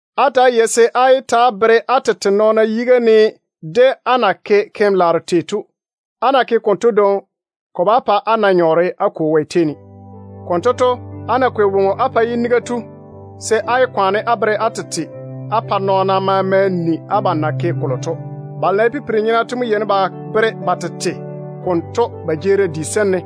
“Ta‑á yei-na se á yé ta‑á bere á tete nɔɔna yiga ne de á na ke keim-laaro tei to. Á ná ke konto dwoŋi, ko bá pa á na nyɔɔre á Kwo Wɛ tei ne. Konto to, á ná kwei woŋo á pa yiniga tu, se á yé kwaane á bere á tete á pa nɔɔna maama nii abam na ke kolo to. Balo na ye pipiri-nyena to mo yeini ba bere ba tete konto dwoŋi ba jeerim di sem ne,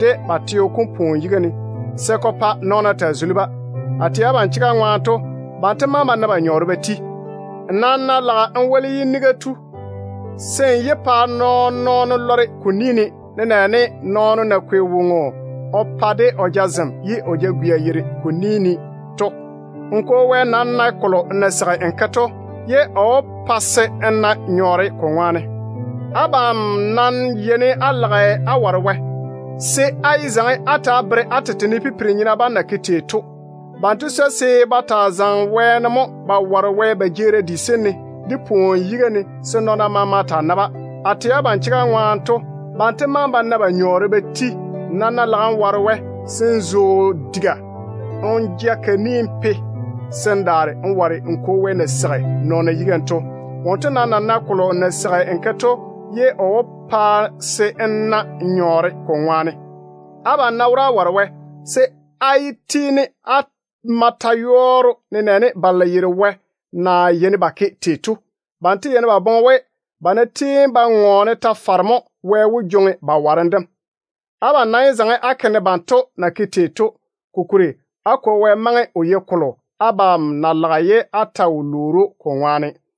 de ba teo kom pwooni yiga ne, se ko pa nɔɔna taa zuli-ba. A tɛ abam chega ŋwaane to, banto maŋe ba na ba nyɔɔre ba ti. Nmo nam ná lage n woli yiniga tu, se n yé pa nɔɔn-nɔɔno lɔre ko ni ne, nenɛɛne nɔɔno na kwei woŋo o pa de o jazem, ye o jagwia yeiri ko ni ne to. N Kwo Wɛ nam nae kolo n na seigi n ke to. O maa wó pa se n na nyɔɔre ko ŋwaane. Abam ná yeini á lage á ware Wɛ, se á yé zaŋe á ta‑á bere á tete ne pipiri-nyena bam na ke tei to. Banto swoi se ba taa zaŋe wɛɛne mo ba ware Wɛ ba jeerim di sem ne, de pwooni yiga ne, se nɔɔna maama taa na-ba. A tɛ abam chega ŋwaane to, banto maŋe ba na ba nyɔɔre ba ti. Nmo nam ná lage n ware Wɛ, se n zo n diga kam wo n ja ka ni n pe, se n laam ware n Kwo Wɛ wom na seigi nɔɔna yiga ne to. Wonto nae kolo n na seigi n ke to. O maa wó pa se n na nyɔɔre ko ŋwaane. Abam ná wora á ware Wɛ, se á yé tiini á ma ta-yɔɔro nenɛɛne balo na yeiri Wɛ na yeini ba ke tei to. Banto yeini ba boŋe we, ba ná tiini ba ŋɔɔne ta-fare mo, Wɛ wó cheigi ba warem dem. Abam nam yé zaŋe á ke ne banto na ke tei to. Kokuri á Kwo Wɛ maŋe o yei kolo abam na gɛa ye á ta wo lwoori‑o ko ŋwaane to.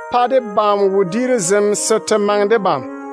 Pa debam wodiiru zem se te maŋe debam.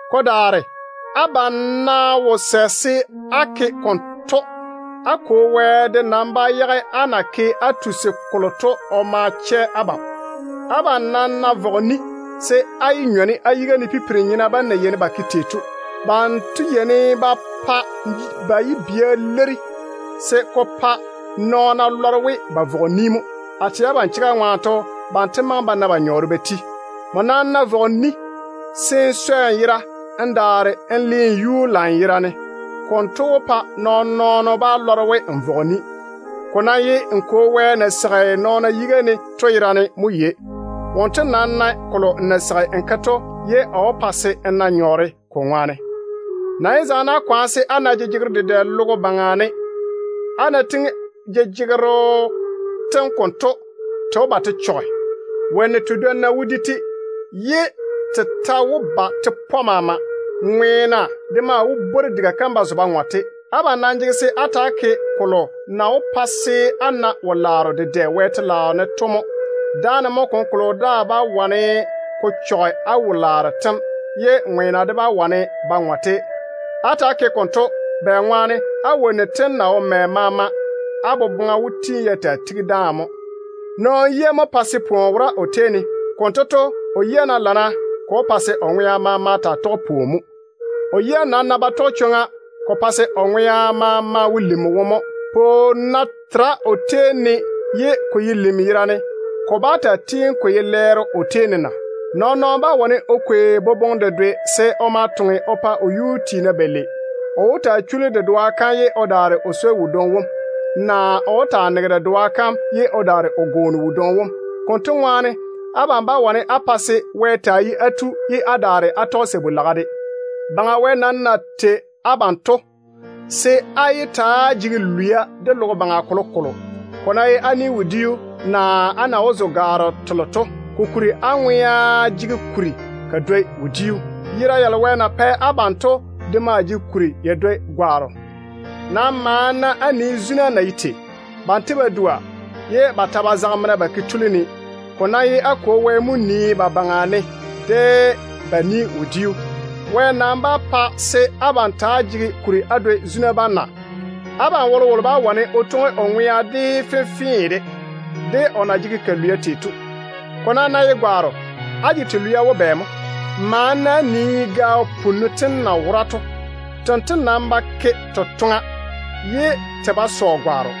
Ko daare, abam ná wo sɛ se á ke konto, á Kwo Wɛ de nam bá yage á na ke kolo á tusi to o ma chɛ abam. Abam nam ná vɔge ni, se á yé nyɔne á yiga ne pipiri-nyena bam na yeini ba ke tei to. Banto yeini ba pa ba yibia leiri se ko pa nɔɔna lɔre we ba vɔge ni mo. A tɛ abam chega ŋwaane to, banto maŋe ba na ba nyɔɔre ba ti. Nmo nam ná vɔge ni, se n swɛ n yera se n daare n le n yuu lanyerane. Konto mo wó pa nɔɔn-nɔɔno bá lɔre we n vɔge ni. Ko ye n Kwo Wɛ wom na seigi nɔɔna yiga ne to yerane mo yei. Wonto nam nae kolo n na seigi n ke to. O maa wó pa se n na nyɔɔre ko ŋwaane. Nam yé zaŋe á kwaane se á na jejegero dedɛ logo baŋa ne. Á ná tiŋi jejegero tem konto, te wó ba te chɔge. Wonnu tedwonna wó di-te, ye te ta wó ba te pɔ maama. Ŋweena de maa wó bwori diga kam ba zo ba ŋɔ-te. Abam nam jege se á ta‑á ke kolo na wó pa se á na wo-laaro dedɛ Wɛ telaao ne to mo. Dáane mo kolokolo daa bá wane ko chɔge á wo-laaro tem, ye ŋweena de bá wane ba ŋɔ-te. Ta‑á ke-na konto bɛŋwaane á wonnu tem na wo mɛ maama to, á boboŋa yɔɔre ya tigi dáane mo. Nɔɔno yia mo pae se o yera jege pwooni. Konto to, o yia ná lana, ko wó pa se o ŋwea maama taa tɔge pwooni mo. O yia nam ná ba lae, ko pae se o ŋwea maama wo lim wone mo. Pwooni ná tera nɔɔno tei ne ye ko ye lim yerane, ko bá taa tiini ko ye lɛɛro mo o tei ne na? Nɔɔn-nɔɔno bá wane o kwei boboŋe dedwe se o ma toŋe o pa o yuu tiina balei. O wó taa chuli dedoa kam ye o daare o swoi wodwoŋi wom, naa o wó taa nege dedoa kam ye o daare o gwooni wodwoŋi wom. Konto ŋwaane, abam bá wane á pa se Wɛ taa ye á tu, ye á daare á tɔge sabu-laga de. Baŋa Wɛ nam na tei abam to, se á yé ta‑á jege lwia de logo baŋa kolokolo, ne ko ná ye á ni-wodiu, naa á na wó zo gwaaro telo to. Kokuri á ŋwea jege kuri ka dwoi wodiu. Yera yalo Wɛ na pɛ abam to de maa jege kuri ya dwoi gwaaro. Nam maane-na á nii zuna na ye tei to. Banto ba dua, ye ba ta ba zage mena ba ke ba tuli ne. Ko nam ye á Kwo Wɛ mo nii zuna bam baŋa ne de ba ni-wodiu. Wɛ nam bá pa se abam ta‑á jege kuri á dwoi zuna bam na? Abam wolowolo bá wane o twoŋi o ŋwea de fenfee de, ne o ná maŋe o jege ka lwia tei de. Ko nam ná ye gwaaro, á jege te lwia wo bɛ mo? Maane-na á nii gaao punnu tem na wora to. Tento ba ke totoŋa, ye te ba sɔ gwaaro.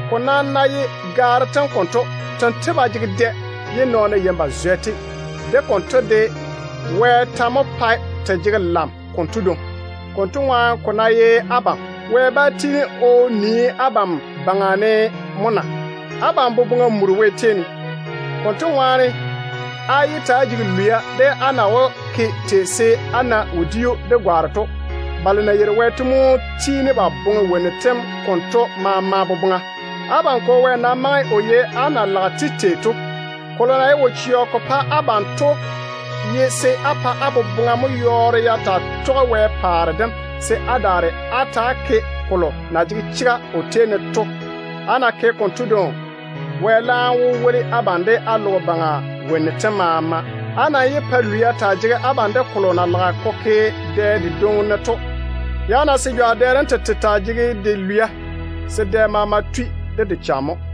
Ko nam ná ye gaaro tem konto, tento ba jege dɛ ye nɔɔna yeini ba zwɛ-te. De konto de, Wɛ ta mo pae te jege lam konto dwoŋi. Konto ŋwaane ko ná ye abam, Wɛ bá tiini o nii abam baŋa ne mo na? Abam boboŋa muri de Wɛ. Konto ŋwaane, á yé ta‑á jege lwia de á na wó ke tei se á na wodiu de gwaaro to. Balo na yeiri Wɛ to mo tiini ba boŋe wonnu tem konto maama boboŋa. Abam Kwo Wɛ nam maŋe o yei á na lage-te tei to. Kolo na ye wo-chɛɔ ko pa abam to ye se á pa á boboŋa mo yɔɔre ya taa tɔge Wɛ paare dem, se á daare á ta‑á ke kolo na jege chega o tei ne to. Á ná ke konto dwoŋi, Wɛ laam wó woli abam de á logo baŋa wonnu tem maama. Á nam yé pa lwia taa jege abam de kolo na lage ko ke dɛ dedwoŋi ne to. Yage-na se jwa dɛ dem tete taa jege de lwia, se dɛ maama tui de de cham mo.